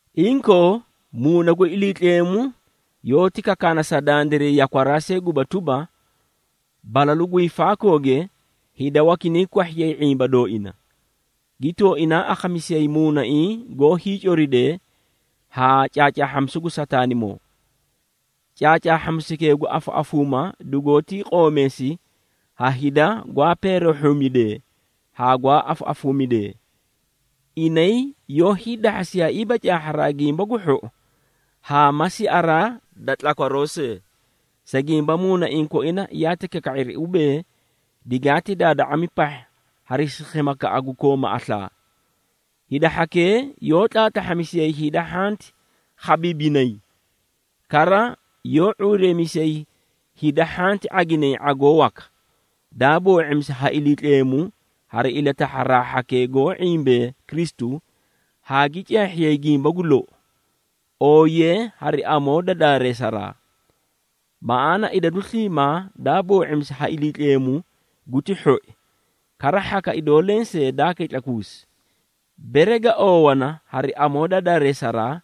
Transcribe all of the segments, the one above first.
Inkoo, Muuna gu Iliitleemu yoóti kakaana sa dandiray yakwaraa see guba tuba, balalu gu hiifaakooge hida wakinay kwahhiyay ⁄imba dooina, gi tooinaa akhamisiyayi muunaiĩ goó hiicoridee haa caacaahhamisu gu Sataanimoo. Caacaahhamisukee gu afaꞌafuuma dugoótii qoomeesi ha hida gwaa peerehhumidee haa gwaa afaꞌafuumidee. Inay yoó hiidahhasiyaaiiba caahharaa gimba gu hhou haa ma siaraa da tlakwaroo see, sa gimba muunaiĩ koina yaati kaka⁄iri ubee, digaati daada⁄ami pahha hari sikhimakaꞌa gu kooma aslaa. Hida hhakee yoó tlaatlahhamisiyay hida hhanti khabiibinay, kara yoó ⁄uureemisiyay hida hhanti ⁄aginay ⁄agoo waka, daa boo⁄imisi ha Iliitleemu hari ilatahharaa hhakee goó ⁄imbee Kristu haa gi caahhiyay gimba gu lou, ooyiyee hari amoo da daareesaraa. Maꞌaana idadu sliimaa daa boo⁄imisi ha Iliitleemu guti hhoi, kara hhaka idoo lensee daa kitlakuusi, bere ga oowana hari amoo da daareesaraa,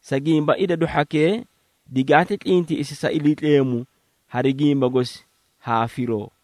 sa gimba idadu hhakee digaati tlintiꞌisi sa Iliitleemu hari gimba gosi haa firoo.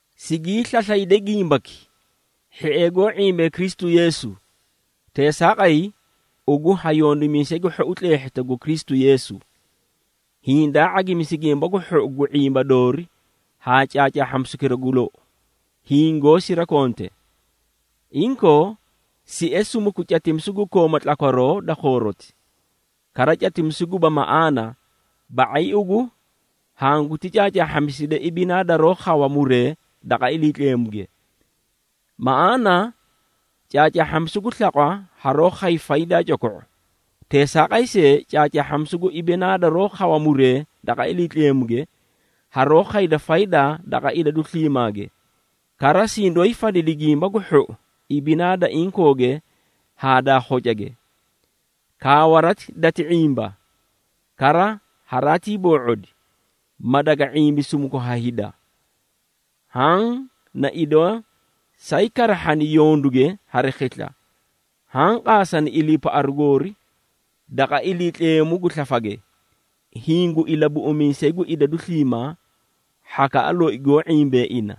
Sigii slaslayde gimbaki, hhiee goó ⁄imbee Kristu Yeesu. Teesaaqay, ugu ha yondimiisay gu hhou tleehhita gu Kristu Yeesu, hiĩ daa ⁄agimisi gimba gu hhou gu ⁄imba doori haa caacaahhamisukira gu lou, hiĩ goó sirakonte. Inkoo, sie sumuku catimisu gu kooma tlakwaroo da khooroti, kara catimisu guba maꞌaana, ba⁄ay ugu hanguti caacaahhamiside ibinaa daroó khawa muree daqa Iliitleemuge. Maꞌaana caacaahhamisu gu slaqwa haroó khay faydaa coko⁄u, teesaaqay see caacaahhamisu gu ibinaa daroó khawa muree daqa Iliitleemuge, haroó khayda faydaa daqa idadu sliimaage, kara sidoóyi fadidi gimba gu hhou ibinaa da inkooge haa daa khocage. Kaawarati dati ⁄imba, kara haraatii boo⁄odi, ma daga ⁄imbi sumuku ha hida. Haã na idoo saay karahhani yonduge hari khisla, haã qaasani iliipaꞌaru goori daqa Iliitleemu gu slafage, hiĩ gu Ilabuꞌumiisay gu hida sliimaa, hhakaꞌa loi goó ⁄imbee ina.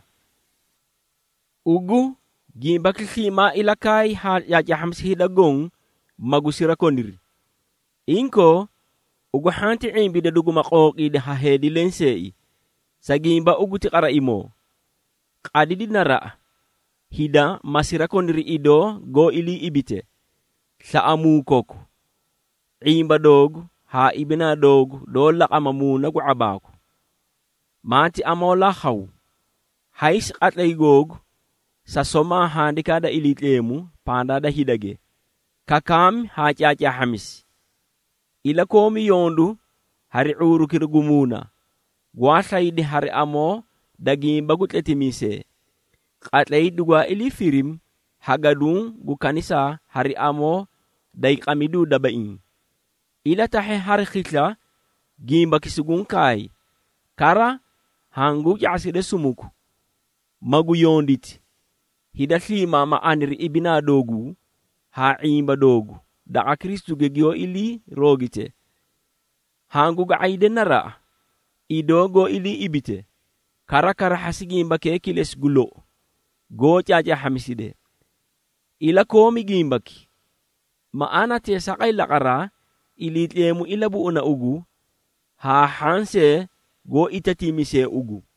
Ugu, gimbaki sliimaa ilakaay haa caacaahhamisi hida goõ, magu sirakoniri. Inkoo, ugu hhanti ⁄imbida duguma qooqiidi ha heedi lenseei, sa gimba ugu ti qaraimoo. Qadidi naraꞌa, hida ma sirakoniri idoo goó ilii ibite, slaꞌamuu koku, ⁄imba doogu haa ibinaa doogu doó laqama muuna gu ⁄abaaku. Maati amoolaa khaw, haysi qatlay googu sa somaa Handikaa da Iliitleemu pandaa da hidage, kakaamii haa caacaahhamisi. Ilakoomi yondu hari ⁄uurukira gu muuna, gwaa slaydi hari amoo da gimba gu tletimiisee, qatlay dugwaa ilii firimi ha gaduũ gu kanisaa hari amoo day qamiduu dabaiĩ. Ilatahhe hari khisla gimbaki suguũ kaay, kara hanguũ ca⁄aside sumuku, magu yonditi, hida sliimaa ma aniri ibinaa dooguu, haa ⁄imba doogu daqa Kristuge giyoó ilii roogite. Hangu ga⁄ayde naraꞌa, idoo goó ilii ibite, kara karahhasi gimbakee kilesi gu lou goó caacaahhamiside. Ilakoomi gimbaki, maꞌaana teesaaqay laqaraa, Iliitleemu ilabuꞌuna ugu haa hhaã see goó itatiimisee ugu.